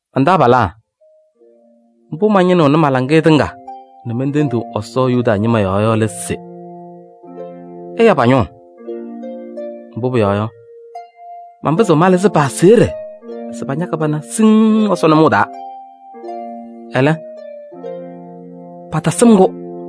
Man-taabalaa, mbʋ mañɩnɩɣnɩ ma-laŋɩyɛ tɩŋa nɛ mentendiɣ Ɛsɔ Yuda ñɩma yɔɔ yɔ lɛ se: ɛya pa-ñʋʋ. Mbʋ pʋyɔɔ yɔ, manpɩzɩɣ malɩzɩ pa-aseɣɖe se pañakɩ pana siŋŋ Ɛsɔ nʋmɔʋ taa. Ɛlɛ, patasɩm-kʋ.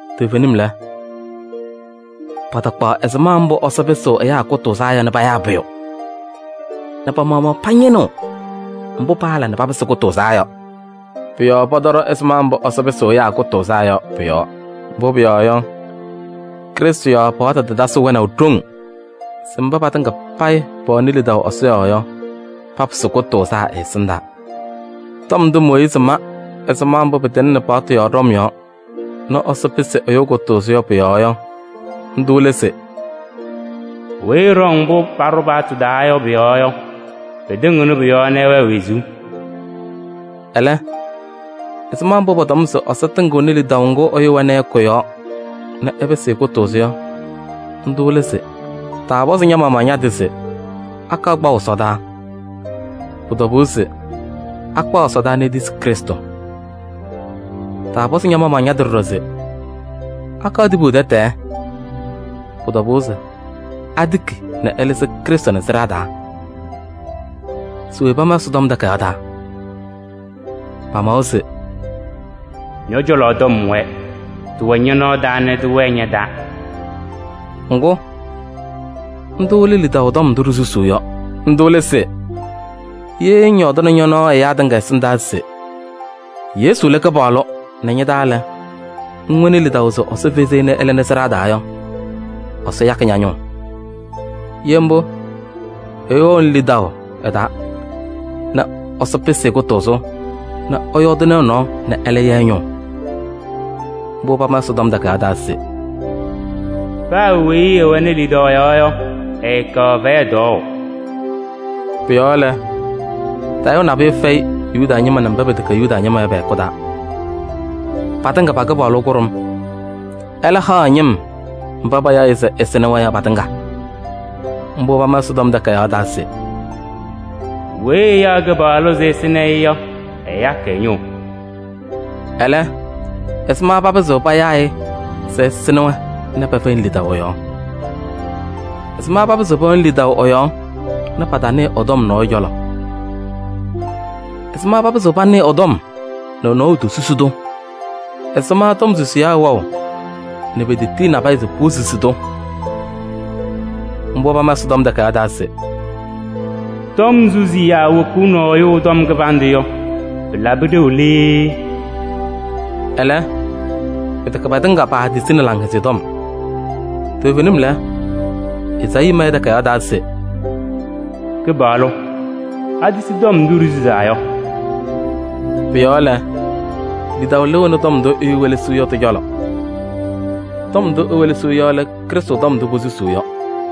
Toovenim lɛ, patakpaɣ ɛzɩma mbʋ Ɛsɔ pɩsɩɣ ɛyaa kʋtʋʋzaa yɔ nɛ payaa pʋyʋ nɛ pa-maɣmaɣ pañɩnɩɣ mbʋ paala nɛ papɩsɩ kʋtʋʋzaa yɔ. Pʋ-yɔɔ pɔtɔɖɔ ɛzɩma mbʋ Ɛsɔ pɩsɩɣ ɛyaa kʋtʋʋzaa yɔ pʋ-yɔɔ. Mbʋ pʋyɔɔ yɔ, Krɩstʋ yɔɔ paɣtʋ tatasɩ wɛnaʋ ɖoŋ se mba patɩŋa payɩ pɛwɛnɩ lidaʋ Ɛsɔ yɔɔ yɔ, papɩsɩ kʋtʋʋzaa ɛ-ɛsɩndaa. Tɔm ndʋ Mooyiizi ma ɛzɩma mbʋ pɩtɩŋnɩ paɣtʋ yɔɔ ɖɔm yɔɔ nɛ Ɛsɔ pɩsɩ ɛyʋ kʋtʋʋzʋ yɔ pʋ-yɔɔ yɔ, ndʋ lɛ se: “Weyi ɛɖɔŋ mbʋ paɖʋ paɣtʋ taa yɔ pʋ-yɔɔ yɔ, pɩtɩŋɩɣnɩ pʋ-yɔɔ nɛ ɛwɛɛ wezuu.” Ɛlɛ, ɛzɩma mbʋ pɔtɔm se Ɛsɔ tɩŋɩɣnɩ lidaʋ ŋgʋ ɛyʋ wɛnɩ ɛ-yɔɔ yɔ kʋ-yɔɔ nɛ ɛpɩsɩ-ɩ kʋtʋʋzʋ yɔ, ndʋ lɛ se: “Taapɔzɩ ña-maɣmaɣ ña-tɩ se akaɣ kpaʋ ɛsɔdaa?” Pʋ-tɔbʋʋ se akpaɣ ɛsɔdaa nɛ etisi Krɩstʋ. Taapɔzɩ ña-maɣmaɣ ña-tɩ ɖɔɖɔ se: “Akaɣ tibu tɛtɛɛ?” Pʋ-tɔbʋʋ se atiki ɛlɩzɩ Krɩstʋ nɛ sɩɖaa taa. Se we pama Ɛsɔtɔm Takayaɣ taa yɔ? Pamawa se: “Ñɔ-cɔlɔ tɔm wɛɛ, tɩwɛ ñɔ-nɔɔ taa nɛ tɩwɛɛ ña-taa.” Ŋgʋ, ndʋ lɛ lidaʋ tɔm ndʋ ɖisusuu yɔ. Ndʋ lɛ se: ye ŋyɔɔdɩnɩ ñɔ-nɔɔ ɛyaa tɩŋa ɛsɩndaa se Yesu lɛ Kɩpaɣlʋ nɛ ña-taa lɛ, ŋwɛnɩ lidaʋ se Ɛsɔ fezi-i nɛ ɛlɩnɩ sɩɖaa taa yɔ, Ɛsɔ yakɩ ña-ñʋʋ. Ye mbʋ, ɛyʋ wɛɣnɩ lidaʋ ɛ-taa nɛ Ɛsɔ pɩsɩ-ɩ kʋtʋʋzʋ, nɛ ɛyɔɔdɩnɩ ɛ-nɔɔ nɛ ɛlɛ ya ɛ-ñʋʋ. Mbʋ pama Ɛsɔtɔm Takayaɣ taa se: “Paa weyi ɛwɛnɩ lidaʋ ɛ-yɔɔ yɔ, ɛɛkaɣ fɛyɛ tɔɔʋ.” Pʋ-yɔɔ lɛ, tayʋʋ nabʋyʋ fɛyɩ Yuda ñɩma nɛ mba pɛtɛkɛ Yuda ñɩma yɔ pɛ-hɛkʋ taa: patɩŋa pa-Kɩpaɣlʋ kʋɖʋm, ɛlɛ haɣ ɛ-ñɩm mba payaɣ-ɩ se ɛsɩnɩ-wɛ yɔ patɩŋa. Mbʋ pama Ɛsɔtɔm Takayaɣ taa se: “Weyi ɛyaɣ Kɩpaɣlʋ se ɛsɩnɩ-ɩ yɔ, ɛyakɩ ɛ-ñʋʋ.” Ɛlɛ, ɛzɩma papɩzɩɣ payaa-ɩ se ɛsɩnɩ-wɛ nɛ pɛfɛyɩnɩ lidaʋ ɛ-yɔɔ? Ɛzɩma papɩzɩɣ pɛwɛnɩ lidaʋ ɛ-yɔɔ nɛ patanɩɩ ɛ-tɔm nɔɔyʋ cɔlɔ? Ɛzɩma papɩzɩɣ panɩɩ ɛ-tɔm nɛ nɔɔyʋ tosusi-tʋ? Ɛzɩma tɔm susiyaa wɛɣ nɛ petetiyi nabɛyɛ se posusi-tʋ? Mbʋ pama Ɛsɔtɔm Takayaɣ taa se: “Tɔm susiyaa wokuuni ɛyʋ tɔm kɩbandʋ yɔ, pɩlabɩ ɖeu lɛ yee!” Ɛlɛ, pɩtɛkɛ patɩŋa paatisini Laŋhɛzɩyɛ Tɔm. Toovenim lɛ, Ezaayii ma ɛ-takayaɣ taa se: “Kɩpaɣlʋ, atisi tɔm ndʋ ɖisusaa yɔ?” Pʋ-yɔɔ lɛ, lidaʋ lɩɣnɩ tɔm ndʋ ɛyʋ welesiɣ yɔ tɩ-cɔlɔ. Tɔm ndʋ ewelesiɣ yɔ lɛ Krɩstʋ tɔm ndʋ posusuu yɔ.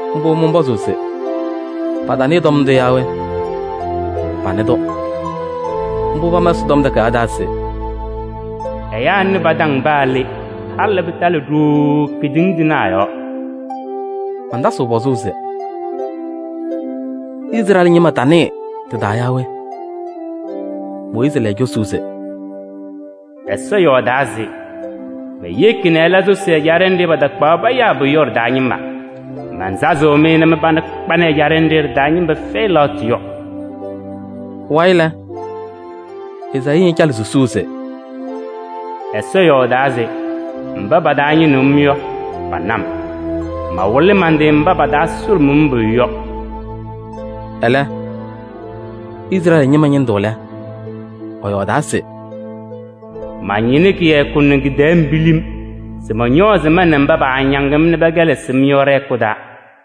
Mbʋ mɔnpɔzʋʋ se: patanɩɩ tɔm ndʋ yaa we? Panɩ-tʋ. Mbʋ pama Ɛsɔtɔm Takayaɣ taa se: “Ɛyaa nɩ pa-taŋ paa le. Halɩ pɩtalɩ ɖooo kedeŋa tɩnaɣ yɔɔ.” Mantasɩɣ pɔzʋʋ se: Izrɛɛlɩ ñɩma tanɩɩ tɩ-taa yaa we? Mooyiizi layɩ cosuu se:“Ɛsɔ yɔɔdaa se: ‘Meyeki nɛ ɩla sʋsɩ ɛjaɖɛ nɖɩ patakpaɣ payaa pʋyʋ yɔ ɖɩ-taa ñɩma. Mansazɩɣ-mɩ nɛ mɩ-pana kpanɩ ɛjaɖɛ nɖɩ ɖɩ-taa ñɩma fɛyɩ lɛɣtʋ yɔ.’” Pʋwayɩ lɛ, Ezaayii ñacanɩ susuu se: “Ɛsɔ yɔɔdaa se: ‘Mba pataañɩnɩɣ-m yɔ, pana-m. Mawɩlɩ man-tɩ mba pataasʋlʋmʋʋ-m pʋyʋ yɔ.’” Ɛlɛ, Izrɛɛlɩ ñɩma ñɩndʋ lɛ, ɛyɔɔdaa se: “Mañɩnɩ kɩyakʋ nɛ kɩ-tɛɛ pilim se mɔñɔɔzɩ ma nɛ mba paañaŋ-m nɛ pɛkɛlɛsɩɣ-m yɔ ɖɛ-hɛkʋ taa.”